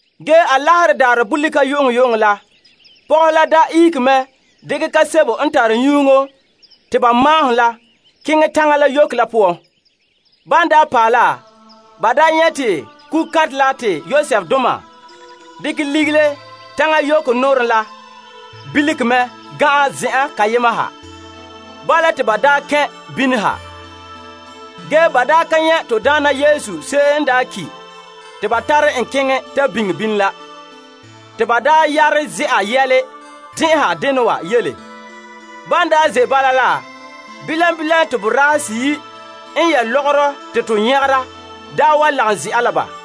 Ge Alaherɛ daarɛ bolika yu'uŋyu'uŋɔ la, pɔgɔhe la daa ihege mɛ dekɛ nyɛga la kaam te ba maahom la ba keŋɛ teŋa yoko la poan. Ban paɛ la, ba nyɛ' te kugukantɛ la te Yosefdoma dekɛ legele teŋa yoko nɔɔrɛ la belege mɛ ga'an zen'an kayema ha. Ban kɛn' bini la, ba ka nyɛ' to Daana Yesu se'em n daa ki' te ba tare en ta biŋe bini la. Ban ze'a yɛle tɛn'ɛha dena wa yele, bilam bilam te boraahe seyi' n yɛ' lɔgɔrɔ te to nyagera wa lagom ze'a la ba.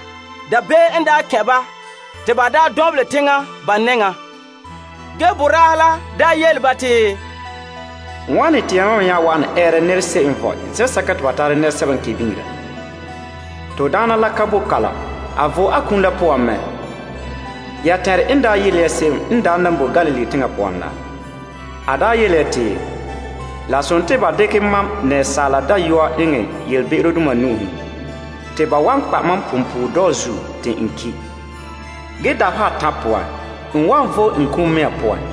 Dabeem kɛn' ba te ba dɔnbelɛ teŋa ba nɛŋa. Ge, boraahe la yele ba te, Wane te yamam me nya wa'ana ɛɛra nɛra se'em n vɔe zen'sɛka te ba tara nɛresɛba n ki' biŋera? A ka boe kalam. A vo'e a kum la poan mɛ. Ya tɛn'ɛre n daa yele ya se'em n daa nan boe Galilee teŋa poan la? A daa yele ya te, La sontii ba dekɛ Asaala Dayɔa eŋɛ be'emdoma nu'uhen. Te ba wan kpa' mam punpuuredɔɔ zuo te n ki'. Ge dabeha atan' poan, n wan vo'e n kum mea poan.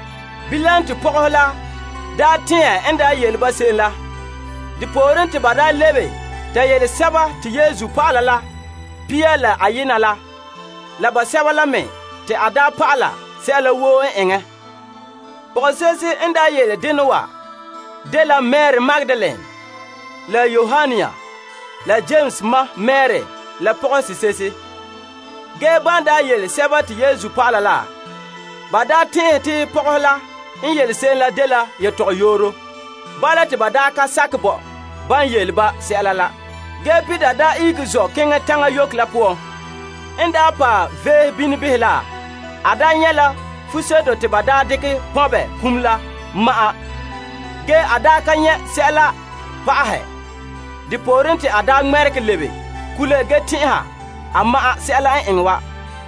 Bilam te pɔgɔhe la tɛɛn en yele ba se'em la. Depooren te ban lebe ta yele Yesu dɔlɔba la pia la ayema la la basɛba n lagom ba sɛla woo n eŋɛ. Pɔgɔse'ehe n yele dena wa dela Mari Magdalene la Yoanna la Yames ma Mari la pɔgɔse'ehe. Ban yele Yesu dɔlɔba la, ba tɛn'ɛhe te pɔgɔhe la n yele se'em la dela tɔgɔyooro. Bala ba ka sakɛ bo ban yele ba sɛla la. Ge Peter ihege zɔ' keŋɛ taŋa yoko la poan. N paɛ veehe behɛ bini la, a nyɛ' la fuseto te ba daa dekɛ pɔnbɛ iŋa la ma'an, ge a ka nyɛ' sɛla le pa'ahɛ. Depooren, te a ŋmɛregɛ lebe kule ge tɛn'ɛha a ma'an sɛla n eŋɛ wa.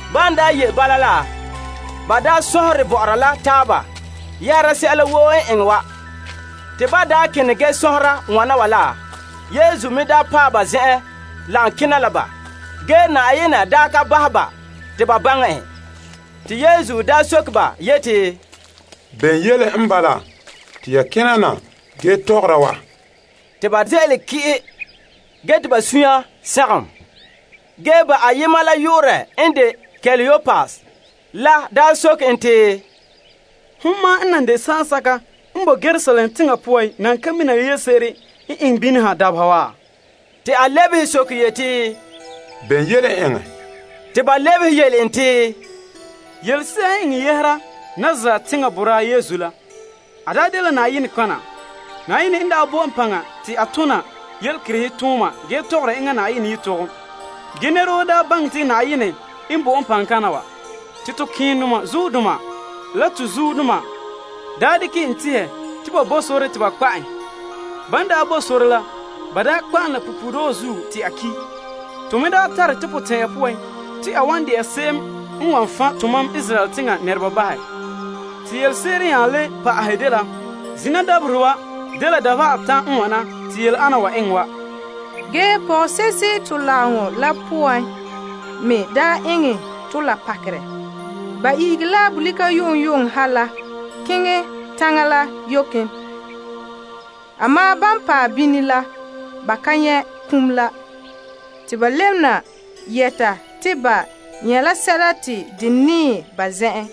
Ban ye' bala la, ba sɔnhere bɔ'ɔra la taaba yɛhera sɛla woo n eŋɛ wa. Te ban kene ge sɔnhera wana wa la, Yesu me paɛ ba zen'en lagom kena la ba. Ge Na'ayenɛ ka bahɛ ba te ba baŋɛ en. Yesu soke ba yeti, Bene yele n bala te ya kena ge tɔgɔra wa? Te ba ze'ele ki'i ge te ba sunya sagom. Ba ayema la yu'urɛ n de Kleopas la nya soke en te, Hon ma'an n nan de saansɛka n bo Yerusalem teŋa poan nan ka mina yelese'ere n eŋɛ bini ha dabeha wa? A lebehe soke yeti, Bene yɛla n eŋɛ? Ba lebehe en te, Yelese'a n eŋɛ yɛhera Nazaret teŋa boraa Yesu la. A daa dela nɔtɔgɔha. Na'ayenɛ n daa bo en paŋa te a tona yelekerehe tooma ge tɔgɔra enŋa Na'ayenɛ yelehom. Ge nɛra woo daa baŋɛ te Na'ayenɛ n bo en paŋa kaŋa wa. Te to malemadaana la to zuodoma daa dekɛ en tehɛ te ba bo sore te ba kpa' en. Ban daa bo sore la, ba daa kpa' en la punpuuredɔɔ zuo te a ki'. To me daa tare to potɛn'ɛra poan te a wan de'a se'em n wan fan' tomam Israel teŋa nɛreba bahɛ. Te yelese'ere n nya le pa'ahɛ dela zina dabaherɛ wa dela dabeha atan' n wane te yele ana wa eŋɛ wa. Ge pɔgɔse'ehe to lagaŋɔ la poan me daa eŋɛ tɔ la pakerɛ. Ba ihege la bolika yu'uŋyu'uŋɔ ha la keŋɛ taŋa la yoken. Ge ban paɛ bini la, ba ka nyɛ' iŋa la. Te ba lebena na yɛta te ba nyɛ' la sɛla te de nɛɛ ba zen'en.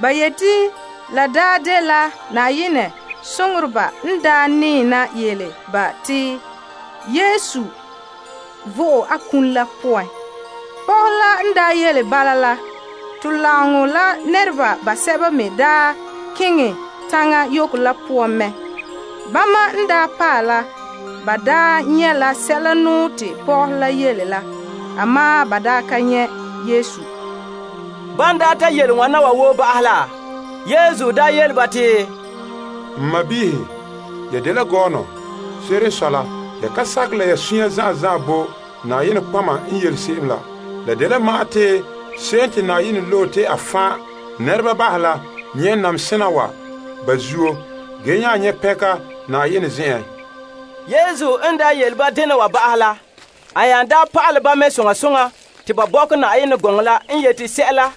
Ba yeti la daa dela Na'ayenɛ soŋoreba n daa nɛɛ na yele ba te Yesu vo'e a kum la poan. Pɔgɔhe la n daa yele bala, la to lagom la nɛreba basɛba me daa keŋɛ taŋa yoko la poan mɛ. Bama n daa paɛ la, ba daa nyɛ' la sɛla te pɔgɔhe la yele la. Ge ba daa ka nyɛ' Yesu. Ban daa ta yele wan wa woo ba'ahɛ la, a yele ba te, N sɔɔnrɔ, ya dela gɔɔnɔ. Se'ere n sɔe la, ya ka sakɛ la ya sunya zan'an zan'an bo nɔtɔgɔheba n yele se'em la. La dela ma'an te se'em te Yenɛ loe la nyɛ' namehe sena wa ba zuo ge nya nyɛ' pɛnka Na'ayenɛ zen'en. En daa yele ba dena wa ba'ahɛ la, a nya pa'alɛ ba mɛ soŋa soŋa te ba bɔkɛ Yenɛ gɔŋɔ la n yete sɛla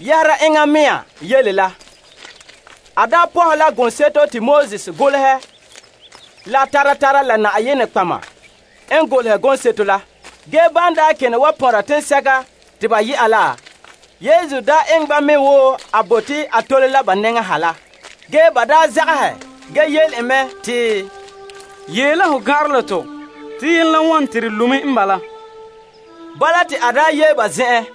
yɛhera enŋa me yele la. A pɔhɛ la gɔŋseto te Moses golehɛ la tara tara la nɔtɔgɔheba n me golehɛ gɔŋseto la. Ban kene wa pɔnra teŋsɛka te ba yɛ'a la, Yesu eŋɛ ba mɛ wo a bote a tole la nɛŋa ha la. Ge ba zagahɛ ge yele en mɛ te, Yee la ho gan'anrɛ la tɔ te yenɛ la wone te de lo' me n bala. Bala te a yee ba zen'en.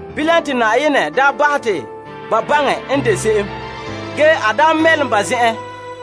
Bilam te Na'ayenɛ bahɛ te ba baŋɛ n de se'em. Ge a mɛlom ba zen'en.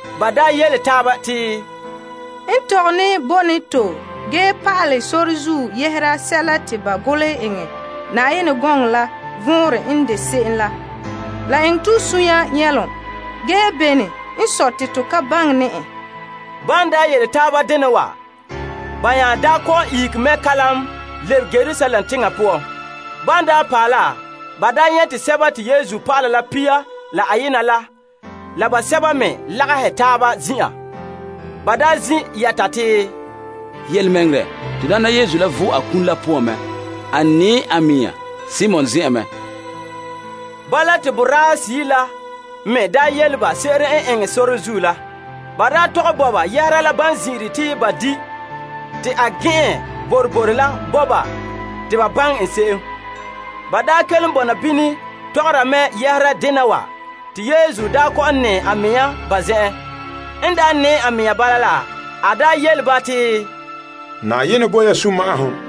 Ba yele taaba te, N tɔgɛ ne bo ne to ge pa'alɛ sore zuo yɛhera sɛla te ba golehɛ eŋɛ Yenɛ gɔŋɔ la vɔnrɛ n de se'em la, la eŋɛ to sunya nyɛlom. Ge bene n sɔe te to ka baŋɛ ne en? Te ba nya kɔ'ɔn ihege mɛ kalam lebe Yerusalem teŋa poan. Ban paɛ la, ba nyɛ' te Yesu dɔlɔba la pia la ayena la la basɛba la me lagahɛ taaba zin'an. Ba zin' yɛta te, Yelemɛŋɛrɛ, to Daana Yesu la vo'e a kum la poan mɛ. A nɛɛ a mɛŋa Simon zen'en mɛ! Bala te ba yele ba se'ere n eŋɛ sore zuo la la ban zin'ire te ba di' te a gɛn'ɛn boroboro la bo ba te baŋɛ en se'em. Ban kelom bɔna bini tɔgɔra mɛ yɛhera dena wa te Yesu kɔ'ɔn nɛɛ a mea ba zen'en, yele ba te, Na'ayenɛ bo ya sunma'ahom.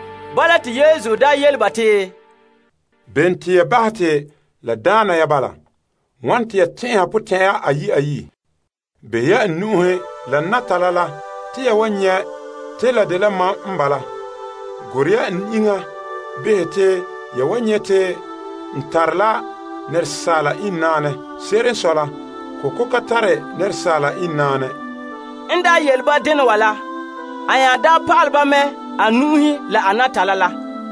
Bala te Yesu nya yele ba te, Bene te ya bahɛ te la daana ya bala? Wane te ya tɛn'ɛha potɛn'ɛra ayi' ayi'? Behɛ ya n nu'uhen la n natala la te yan wan nyɛ' te la dela mam n bala. Gorɛ ya n iŋa behɛ te ya wan nyɛ' te n tara la asaala iŋnaanɛ. Se'ere n sɔe la, kɔkɔ ka tare asaala iŋnaanɛ. En daa yele ba wana wa la, a nya pa'alɛ ba mɛ a nu'uhen la a natala la.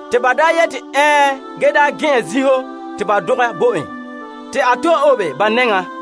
Te ba gɛn'ɛn zinho te ba dɔgɛ bo en, te a to'e obe ba nɛŋan.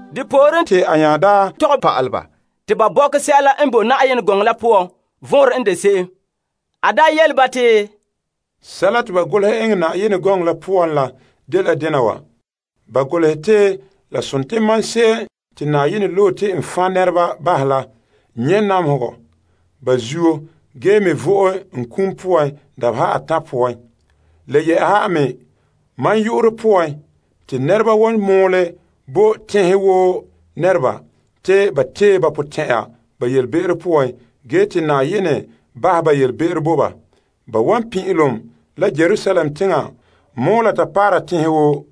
Depooren te a nya tɔgɛ pa'alɛ ba te ba bɔkɛ sɛla n boe Yenɛ gɔŋɔ la poan vɔnrɛ n de se'em. A yele ba te, Sɛla te ba golehɛ eŋɛ Yenɛ gɔŋɔ la poan dela: ba golehɛ te se'em te Na'ayenɛ loe te wan nyɛ' namehegɔ ge me vo'e n kum dabeha atan' poan. Le yɛ'ɛha me, a yu'urɛ poan te nɛreba wan mɔɔlɛ te nɛreba tee ba potɛn'ɛra ba be'em poan ge te Na'ayenɛ bahɛ ba be'em bo ba. Ba wan pin'ilom la Yerusalem teŋa mɔɔla ta paara teŋhe woo.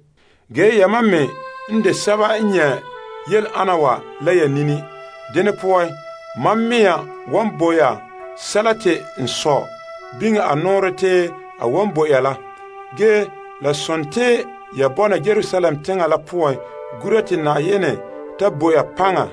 Ge yamam me n de sɛba n nyɛ' yele ana wa la ya nini. Dene poan, mam mea wan bo ya sɛla te n Sɔ' biŋe a nɔɔrɛ te a wan bo ya la. Ge la sontii ya bɔna Yerusalem teŋa la poan gura te Na'ayenɛ ta bo ya paŋa.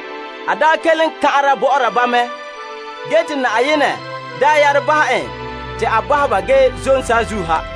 En kelom kan'ara bɔ'ɔra ba mɛ ge te Na'ayenɛ yare bahɛ en te a bahɛ ba ge zom saazuo ha.